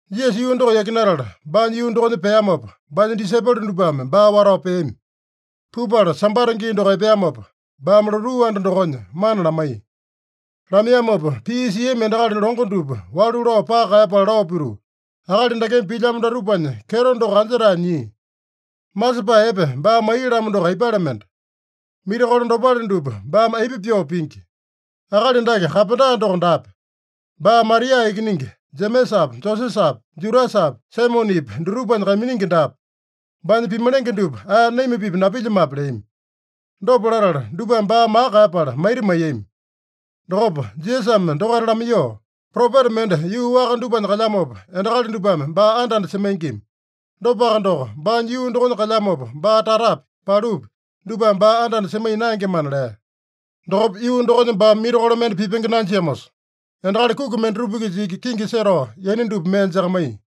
Jisasa yuu doko yakinatala baanya yuu dokonya peamopa, baanya disaipolo dupame baa watao peami. Pupala Sambata gii doko epeamopa, baame lotuu anda dokonya mana lamaiya. Lamaiyamopa pii siami endakali longo dupa walu lao paka kaeyapala lao pituu, “Akali dakeme pilyamo datupanya kyeto doko anja-tae nyia? Masepae epe baa maiya-lamo doko aipale mende? Mirakolo dopale dupa baame aipa pyoo pingi? Akali dake kapenda doko daape? Baa Maria ikiningi, Jemesapi, Josesapi, Judasapi, Saimonepi dutupanya kaiminingi daape? Baanya pimalenge dupa ae naima-pipa napilyamape?” leami. Dopa latala dupame baa maka kaeyapala maita maiyami. Dokopa Jisasame dokaita lamaiyoo, “Propeta mende yuu waka dupanya kalyamopa, endakali dupame baa anda-anda semaingima. Dopaka doko, baanya yuu dokonya kalyamopa, baa tatapi, palupi dupame baa anda-anda semaiya naengemana” lea. Dokopa yuu dokonya baame mirakolo mende pipenge nanjiamosa, endakali kuki mendatupa-kisa iki kingi setao yaina dupa mee jakamaiya.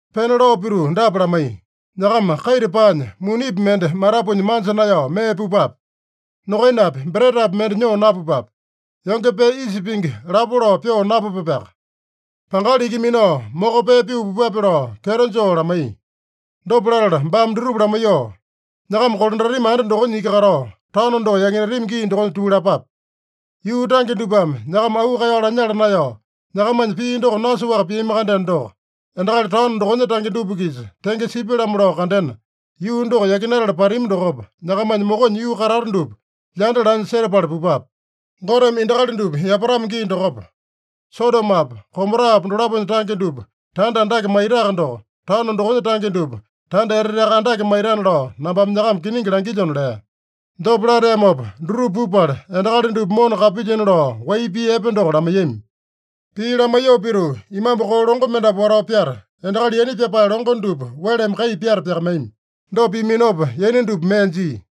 Pena lao pituu dapa lamaiya: “Nyakama kaita paanya, munipi mende matapunya manja naeyao mee pupape. Nokainapi, bretapi mende nyoo napupape. Yonge pee isa pingi lapo lao pyoo napupapeaka. Pangali iki minao moko pee pyoo pupape” lao kyeto joo lamaiya. Dopa latala baame dutupa lamaiyoo, “Nyakama kolandatami anda dokonya iki katao, taono doko yakinatami gii dokonya tuu lapape. Yuu tange dupame nyakama auu kaeyao lanyala naeyao, nyakamanya pii doko nasoaka piami-kandeno doko, endakali taono dokonya tange dupa-kisa tenge sipya-lamo lao kandena, yuu doko yakinatala patami dokopa, nyakamanya mokonya yuu katata dupa lyanda lanya setapala pupape. Goteme endakali dupa yapatamo gii dokopa, Sodomopa, Gomorapa dolaponya tange dupa tanda andake maitaka doko, taono dokonya tange dupa tanda eteteaka andake maitana lao nambame nyakama kiningi langilyona” lea. Dopa lateamopa dutupa pupala, endakali dupa mona kapilyina lao wai pii epe doko lamaiyami. Pii lamaiyoo pituu, imambu koo longo mendapu watao pyata, endakali yaina pyapae longo dupa weleme kai pyata pyakamaiyami. Dopa piaminopa yaina dupa mee jia.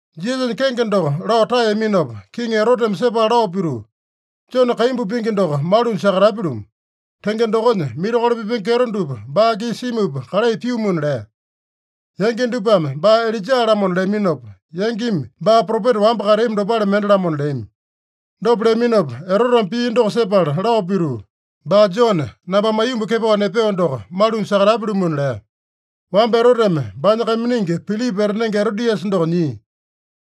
Jisasanya kenge doko lao taeyaminopa, Kiŋi Eroteme sepala lao pituu, “Jone kaimbu pingi doko malunya sakatapya-lumu. Tenge dokonya, mirakolo pipenge kyeto dupa baa-kisa simupa kalai pyumuna” lea. Yangi dupame “Baa Ilaija-lamona” leaminopa, yangimi “Baa propeta wamba kateami dopale mende-lamona” leami. Dopa leaminopa Eroteme pii doko sepala lao pituu, “Baa Jone, nambame aiyomba kepao nepeo doko, malunya sakatapya-lumuna” lea. Wamba Eroteme baanya kaiminingi Pilipa etanenge Erodiasa doko nyia.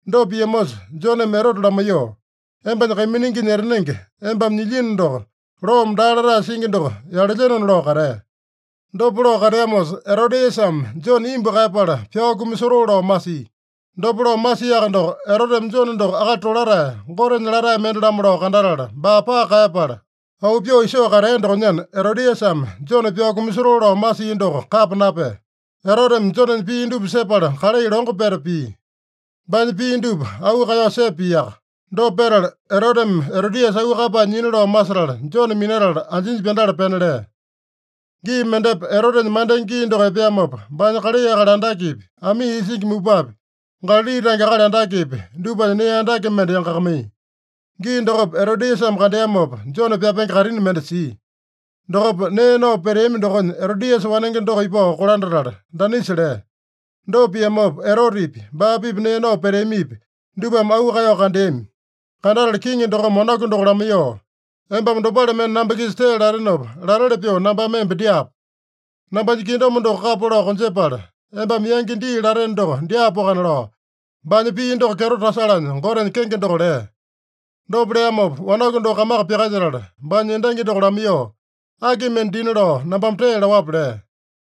Dopa piamosa Joneme Erote lamaiyoo, “Embanya kaimininginya etanenge embame nyilyino doko, loome daa latae singi doko yalelyenona” lao katea. Dopa lao kateamosa, Erodiasame Jone imbu kaeyapala pyao kumasotoo lao masia. Dopa lao masiaka doko, Eroteme Jone doko akali tolatae, Gotenya latae mende-lamo lao kandatala, baa paka kaeyapala, auu pyoo isoo katea dokonyana, Erodiasame Jone pyao kumasotoo lao masia doko kapa napea. Eroteme Jonenya pii dupa sepala kalai longo peta pia. Baanya pii dupa auu kaeyao sepa piaka. Dopa petala Eroteme Erodiasa auu kaeyapae nyina lao masetala, Jone minatala anjinya pyandala pena lea. Gii mendepa Erotenya mandenge gii doko epeamopa, baanya kalai akali andakepi, amii isingi mupapi, Galali tange akali andakepi, dupanya nee andake mende yangakamaiya. Gii dokopa Erodiasame kandeamopa, Jone pyapenge kaitini mende sia. Dokopa nee nao peteami dokonya Erodiasa wanenge doko ipao kolandatala danisa lea. Dopa piamopa, Erotepi, baa-pipa nee nao peteamipi, dupame auu kaeyao kandeami. Kandatala kiŋi dokome wanaku doko lamaiyoo, “Embame dopale mende namba-kisa tee latenopa, lateli pyoo nambame emba dyaapo. Nambanya kingdom doko kapa lao konjepala, embame yangi dii lateno doko dyaapoakana” lao, baanya pii doko kyeto tasalanya Gotenya kenge doko lea. Dopa leamopa, wanaku doko kamaka pyakalyetala baanya endangi doko lamaiyoo, “Aki mende dina lao nambame tee laowape?” lea.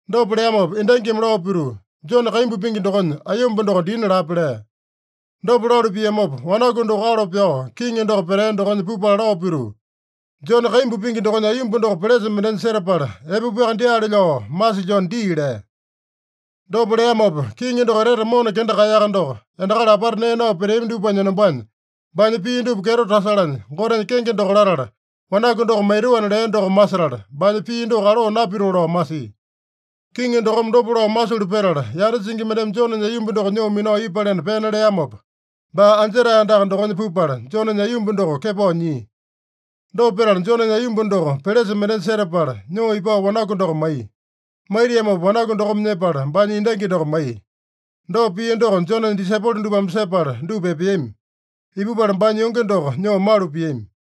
Dopa leamopa endangimi lao pituu, “Jone kaimbu pingi dokonya aiyomba doko dina lape” lea. Dopa lalu piamopa, wanaku doko alo pyao kiŋi doko petea dokonya pupala lao pituu, “Jone kaimbu pingi dokonya aiyomba doko pelesa mendenya setapala epapuaka dyaale lao masilyona dii” lea. Dopa leamopa kiŋi doko etete mona kenda kaeyaka doko, endakali apata nee nao peteami dupanya enombanya, baanya pii dupa kyeto tasalanya Gotenya kenge doko latala, wanaku doko maitoana lea doko masetala, baanya pii doko aloo napitoo lao masia. Kiŋi dokome dopa lao masulu petala, yanda singi mendeme Jonenya aiyomba doko nyoo minao ipalena pena leamopa, baa anjetae andaka dokonya pupala, Jonenya aiyomba doko kepao nyia. Dopa petala, Jonenya aiyomba doko pelesa mendenya setapala, nyoo ipao wanaku doko maiya. Maitiamopa wanaku dokome nyepala, baanya endangi doko maiya. Dopa pia doko Jonenya disaipolo dupame sepala dupa epeami. Ipupala baanya yonge doko nyoo malu piami.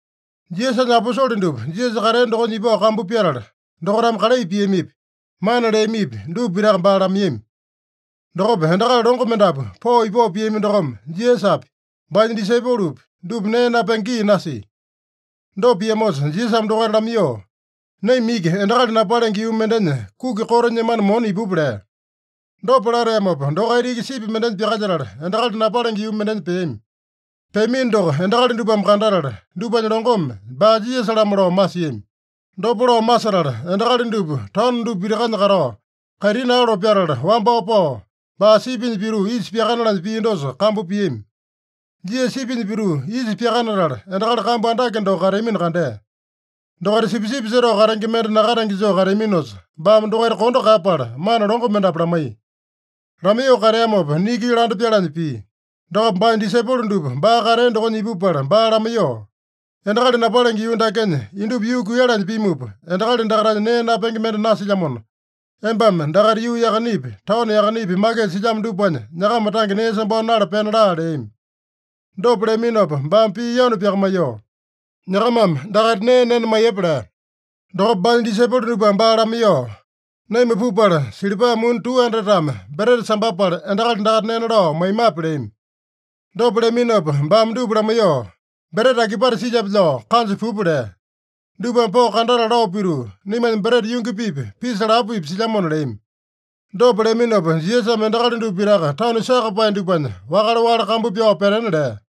Jisasanya aposole dupa Jisasa katea dokonya ipao kambu pyatala, dokaitame kalai piamipi, mana leamipi, dupa pitaka baa lamaiyami. Dokopa endakali longo mendapu pao-ipao piami dokome, Jisasapi, baanya disaipolopi, dupa nee napenge gii nasia. Dopa piamosa Jisasame dokaita lamaiyoo, “Naima iki endakali napalenge yuu mendenya kuki koto nyemana mona ipupa” lea. Dopa lateamopa, dokaita iki sipi mendenya pyakalyetala, endakali napalenge yuu mendenya peami. Peamino doko endakali dupame kandatala, dupanya longome baa Jisasa-lamo lao masiami. Dopa lao masetala, endakali dupa taono dupa pitakanya katao, kaitini alo pyatala wambao pao, baa sipinya pituu isa pyakanalanya pia dosa kambu piami. Jisasa sipinya pituu isa pyakanatala, endakali kambu andake doko kateamino kandea. Dokaita sipisipi setao katenge mende nakatenge joo kateaminosa, baame dokaita kondo kaeyapala mana longo mendapu lamaiya. Lamaiyoo kateamopa niki landa pyalanya pia. Dokopa baanya disaipolo dupa baa katea dokonya ipupala baa lamaiyoo, “Endakali napalenge yuu dakenya indupa yuu kuiyalanya pimupa, endakali dakaitanya nee napenge mende nasilyamona, embame dakaita yuu yakanepi, taono yakanepi, makisa silyamo dupanya nyakama tange nee sambao nala pena laa” leami. Dopa leaminopa baame pii yanu pyakamaiyoo, “Nyakamame dakaita nee nena maiyepa” lea. Dokopa baanya disaipolo dupame baa lamaiyoo, “Naima pupala, silipa muni 200-tame breta sambapala, endakali dakaita nena lao maimape?” leami. Dopa leaminopa baame dupa lamaiyoo, “Breta akipate silyape lao kanja pupa” lea. Dupame pao kandatala lao pituu, “Naimanya breta yungi-pipa, pisa lapo-pipa silyamona” leami. Dopa leaminopa, Jisasame endakali dupa pitaka tanu sakapae dupanya wakale-wakale kambu pyao petena lea.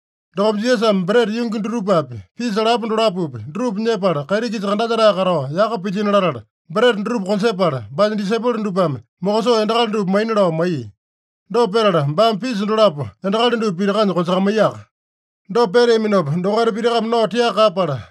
Dokopa Jisasame breta yungi dutupapi, pisa lapo dolapopi, dutupa nyepala, kaiti-kisa kandalyetae katao yaka pilyino latala, breta dutupa konjepala, baanya disaipolo dupame mokosoo endakali dupa maina lao maiya. Dopa petala baame pisa dolapo endakali dupa pitakanya konjakamaiyaka. Dopa peteamopa dokaita pitakame nao tiaka kaeyapala,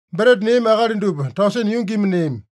Breta neami akali dupa tausene yungimi neami.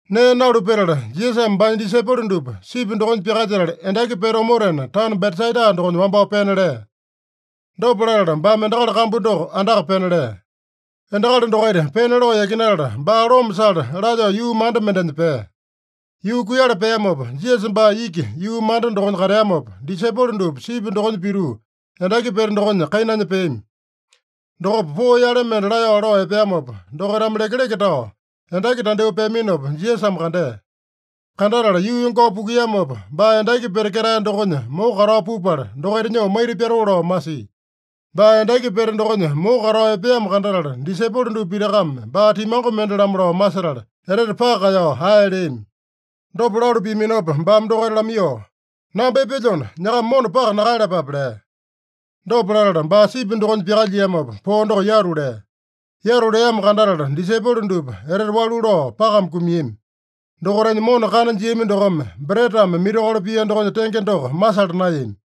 Nee nalu petala, Jisasame baanya disaipolo dupa sipi dokonya pyakalyetala endaki pete omotena, taono Betsaida dokonya wambao pena lea. Dopa latala, baame endakali kambu doko andaka pena lea. Endakali dokaita pena lao yakinatala, baa loma sala lalyoo yuu manda mendenya pea. Yuu kuiyala peamopa, Jisasa baa iki yuu manda dokonya kateamopa, disaipolo dupa sipi dokonya pituu endaki pete dokonya kainanya peami. Dokopa poo yale mende laeyao lao epeamopa, dokaitame lekeleke tao endaki tandyoo peaminopa, Jisasame kandea. Kandatala yuu yongao pukuiyamopa, baa endaki pete ketae dokonya moko katao pupala, dokaita nyoo maita pyatoo lao masia. Baa endaki pete dokonya moko katao epeamo kandatala, disaipolo dupa pitakame baa timango mende-lamo lao masetala, etete paka kaeyao ae leami. Dopa lalu piaminopa baame dokaita lamaiyoo, “Namba epelyona, nyakama mona paka nakaeyalapape” lea. Dopa latala baa sipi dokonya pyakalyiamopa, poo doko yatu lea. Yatu leamo kandatala disaipolo dupa etete walu lao pakame kumiami. Dokaitanya mona kana jiami dokome, bretame mirakolo pia dokonya tenge doko masala naeyami.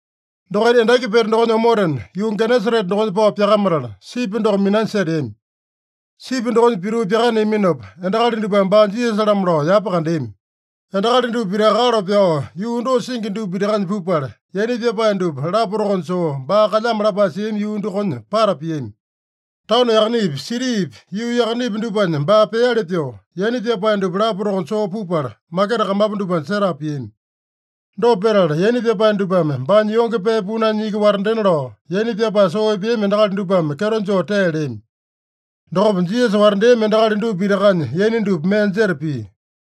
Dokaita endaki pete dokonya omotena, yuu Genesarete dokonya pao pyakamatala, sipi doko minanya seteami. Sipi dokonya pituu pyakaneaminopa, endakali dupame baa Jisasa-lamo lao yapa kandeami. Endakali dupa pitaka alo pyao yuu dosa singi dupa pitakanya pupala, yaina pyapae dupa lapa tokonya soo baa kalyamo lapae siami yuu dokonya pata piami. Taono yakanepi, sitipi, yuu yakanepi dupanya baa peali pyoo, yaina pyapae dupa lapa tokonya soo pupala, maketa kamapu dupanya setapa piami. Dopa petala, yaina pyapae dupame baanya yonge pee punanya iki watandena lao, yaina pyapae soo epeami endakali dupame kyeto joo tee leami. Dokopa Jisasa watandeami endakali dupa pitakanya yaina dupa mee jeta pia.